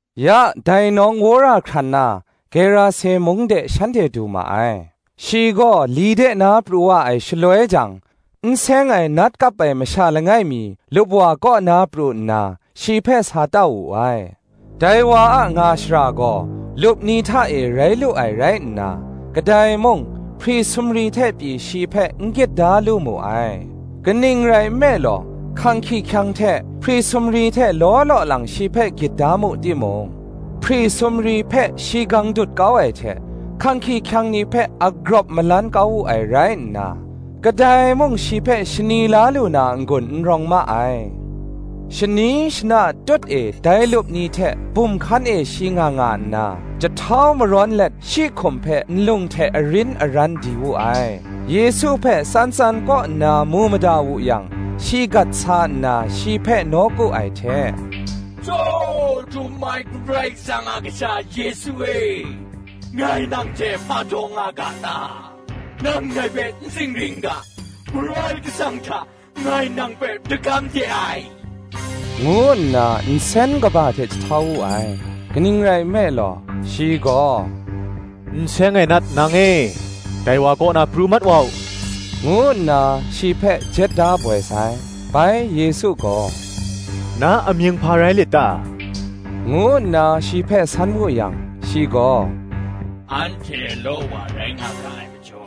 Ya dai nawng wora hkran na, Gerase mung de shanhte du ma ai. Shi gaw li de na pru wa ai shaloi jang, n seng ai nat kap ai masha langai mi lupwa kaw na pru nna, shi hpe sa tau wu ai. Dai wa a nga shara gaw, lup ni hta e rai lu ai rai nna, kadai mung, hpri sumri hte pyi shi hpe n gyit da lu mu ai; kaning rai nme law, hkang hkyihkyang hte hpri sumri hte law law lang shi hpe gyit da mu timung, hpri sumri hpe shi gang dut kau ai hte, hkang hkyihkyang ni hpe agrawp malan kau wu ai rai nna, kadai mung shi hpe shani la lu na n-gun n rawng ma ai. Shani shana tut e dai lup ni hte bum hkan e shi nga nga nna, jahtau marawn let shi hkum hpe nlung hte arin aran di wu ai. Yesu hpe tsan tsan kaw nna mu mada wu yang, shi gat sa nna shi hpe nawku ai hte, “Tsaw Htum ai Karai Kasang a Kasha Yesu e, ngai nang hte hpa daw nga ga ta? Nang ngai hpe n zingri n ga, Karai Kasang hta, ngai nang hpe dagam de ai,” ngu nna nsen kaba hte jahtau wu ai. Kaning rai nme law, shi gaw, “N seng ai nat, nang e, dai wa kaw na pru mat wa u,” ngu nna shi hpe jet da boi sai. Bai Yesu gaw, “Na amying hpa rai lit ta? ngu nna shi hpe san wu yang, shi gaw, Anhte law wa rai nga ga ai majaw,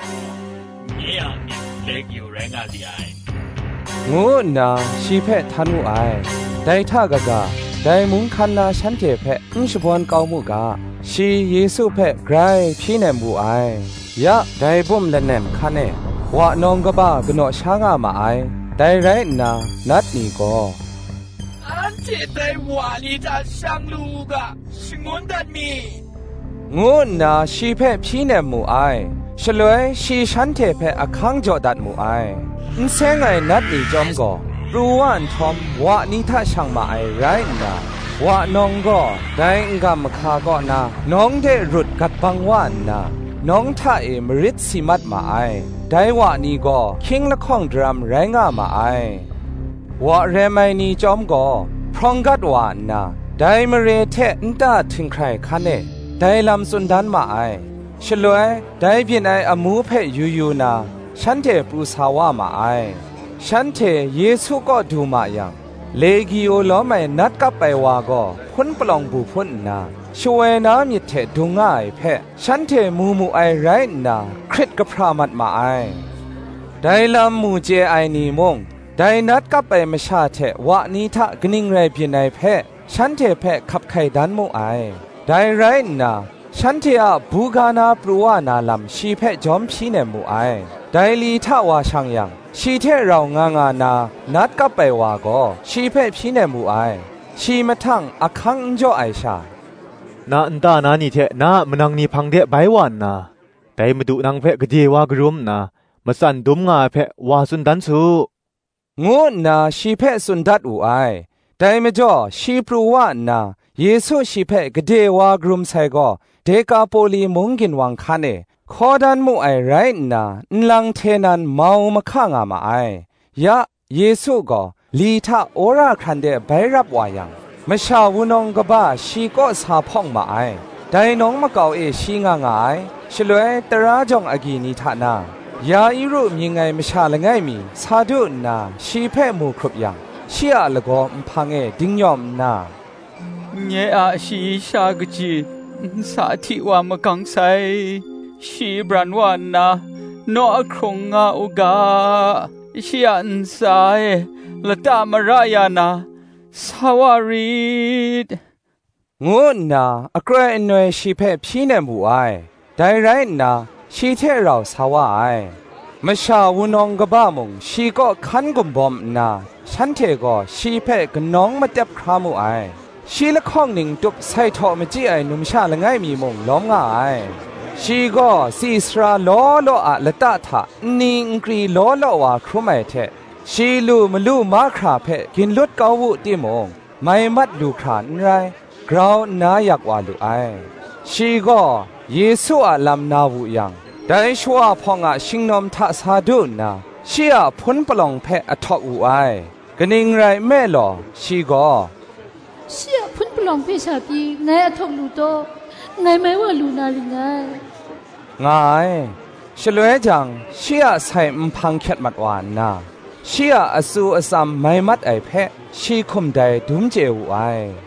nye a amying Legio rai nga li ai,” ngu nna shi hpe htan wu ai. Dai hta kaga, dai mung hkan na shanhte hpe n shabawn kau mu ga, shi Yesu hpe grai hpyi nem wu ai. Ya, dai bum lanem hkan e, wa nawng kaba kanaw sha nga ma ai. Dai rai nna, nat ni gaw, “Anhte dai wa ni hta shang lu u ga, shangun dat mi,” ngu nna shi hpe hpyi nem mu ai. Shaloi shi shanhte hpe ahkang jaw dat mu ai. N seng ai nat ni chyawm gaw, pru wa nhtawm wa ni hta shang ma ai rai nna, wa nawng gaw dai n-gam mahka kaw na nawng de rut gat bang wa nna, nawng hta e marit si mat ma ai: dai wa ni gaw hkying lahkawng daram rai nga ma ai. Wa rem ai ni chyawm gaw, hprawng gat wa nna, dai mare hte nta htinghkrai hkan e, dai lam tsun dan ma ai. Shaloi, dai byin ai amu hpe yu yu na, shanhte pru sa wa ma ai. Shanhte Yesu kaw du ma yang, Legio lawm ai nat kap ai wa gaw, hpun palawng bu hpun nna, shawoi na myit hte dung nga ai hpe, shanhte mu mu ai rai nna, hkrit kahpra mat ma ai. Dai lam mu chye ai ni mung, dai nat kap ai masha hte wa ni hta kaning rai byin ai hpe, shanhte hpe hkap hkai dan mu ai. Dai rai nna, shanhte a buga na pru wa na lam shi hpe jawm hpyi nem mu ai. Dai li hta wa shang yang, shi hte rau nga nga na, nat kap ai wa gaw shi hpe hpyi nem wu ai. Shi mahtang ahkang n jaw ai sha, “Na nta na ni hte na a manang ni hpang de bai wa nna, dai Madu nang hpe gade wa karum nna, matsan dum nga ai hpe, wa tsun dan su,” ngu nna shi hpe tsun dat wu ai. Dai majaw shi pru wa nna, Yesu shi hpe gade wa karum sai gaw Dekapoli mung ginwang hkan e, hkaw dan mu ai rai nna, nlang hte nan mau mahka nga ma ai. Ya, Yesu gaw li hta wora hkran de bai rap wa yang, masha wunawng kaba shi kaw sa hpawng ma ai; dai nawng makau e shi nga nga ai. Shaloi, tara jawng agyi ni hta na, Ya-iru mying ai masha langai mi sa du nna shi hpe mu hkrup yang, shi a lagaw nhpang e dingnyawm nna, “Nye a shayi sha kaji nsa hti wa magang sai: shi bran wa nna, naw ahkrung nga u ga, shi a ntsa e lata mara ya na, sa wa rit,” ngu nna akroi anoi shi hpe hpyi nem wu ai. Dai rai nna, shi hte rau sa wa ai. Masha wunawng kaba mung, shi kaw hkan gumbawm nna, shanhte gaw shi hpe kanawng matep hkra mu ai. Shi lahkawng ning tup sai htaw machyi ai numsha langai mi mung lawm nga ai: shi gaw tsi sara law law a lata hta nni nkri law law wa hkrum ai hte, shi lu malu mahkra hpe ginlut kau wu timung, mai mat lu hkra n rai, grau nna yak wa lu ai; shi gaw Yesu a lam na wu yang, dai shawa hpawng a shingnawm hta sa du nna, shi a hpun palawng hpe ahtawk wu ai. Kaning rai nme law, shi gaw, “Shi a hpun palawng hpe sha pyi ngai ahtawk lu taw, ngai mai wa lu na ring ngai,” nga ai. Shaloi jang, shi a sai nhpang hkyet mat wa nna, shi a atsu atsam mai mat ai hpe, shi hkum dai dum chye wu ai.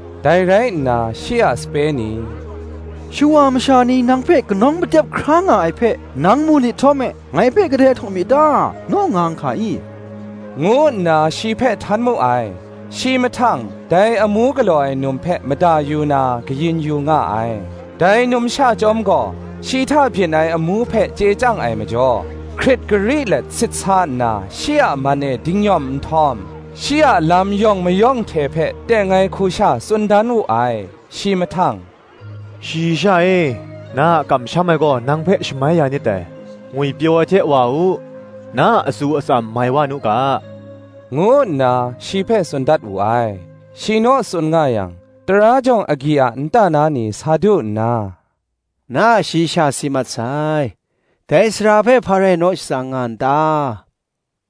Dai rai nna shi a sape ni, “Shawa masha ni nang hpe kanawng matep hkra nga ai hpe, nang mu nit htawm e, ‘Ngai hpe kadai ahtawk mi ta? naw nga n hka i?” ngu nna shi hpe htan mu ai. Shi mahtang, dai amu galaw ai num hpe mada yu na, kayin yu nga ai. Dai numsha chyawm gaw, shi hta byin ai amu hpe chye chyang ai majaw, hkrit gari let sit sa nna, shi a man e dingnyawm nhtawm, shi a lam yawng mayawng hte hpe teng ai hku sha tsun dan wu ai. Shi mahtang, “Shayi sha e, na a kamsham ai gaw nang hpe shamai ya nit dai: ngwipyaw ai hte wa u: na a atsu atsam mai wa nu ga,” ngu nna shi hpe tsun dat wu ai. Shi naw tsun nga yang, tara jawng agyi a nta na ni sa du nna, “Na a shayi sha si mat sai; dai sara hpe hpa rai naw shatsang nga n ta?”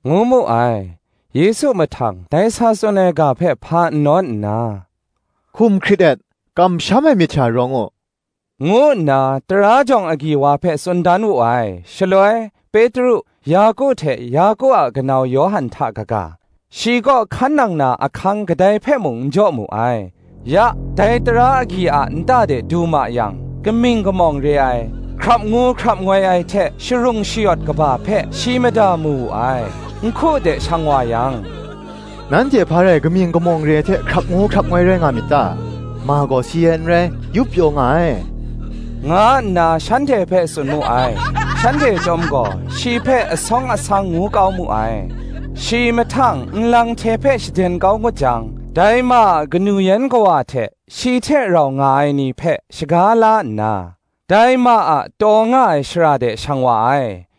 ngu mu ai. Yesu mahtang dai sa tsun ai ga hpe hpa n nawn nna, “Hkum hkrit et; kamsham ai myit sha rawng u,” ngu nna tara jawng agyi wa hpe tsun dan wu ai. Shaloi, Petru, Yaku hte Yaku a kanau Yawhan hta kaga, shi kaw hkan nang na ahkang kadai hpe mung n jaw mu ai. Ya, dai tara agyi a nta de du ma yang, kaming kamawng re ai, hkrap ngu hkrap ngoi ai hte sharung shayawt kaba hpe shi mada mu wu ai: nhku de shang wa yang, “Nanhte hpa rai kaming kamawng re ai hte hkrap ngu hkrap ngoi rai nga myit ta? ma gaw si ai n rai, yup pyaw nga ai,” nga nna shanhte hpe tsun mu ai. Shanhte chyawm gaw shi hpe asawng asang ngu kau mu ai. Shi mahtang nlang hte hpe shaden kau ngut jang, dai ma a kanu yan kawa hte shi hte rau nga ai ni hpe, shaga la nna, dai ma taw nga ai shara de shang wa ai: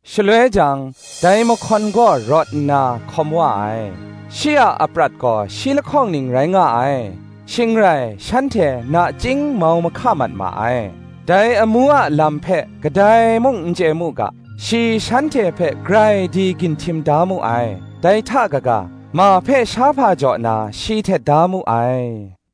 Shaloi jang, dai mahkawn gaw rawt nna, hkawm wa ai: shi a aprat gaw shi lahkawng ning rai nga ai. Shing rai shanhte nachying mau mahka mat ma ai. Dai amu a lam hpe kadai mung n chye mu ga, shi shanhte hpe grai di ginhtim da mu ai: dai hta kaga, ma hpe shahpa jaw na, shi htet da mu ai.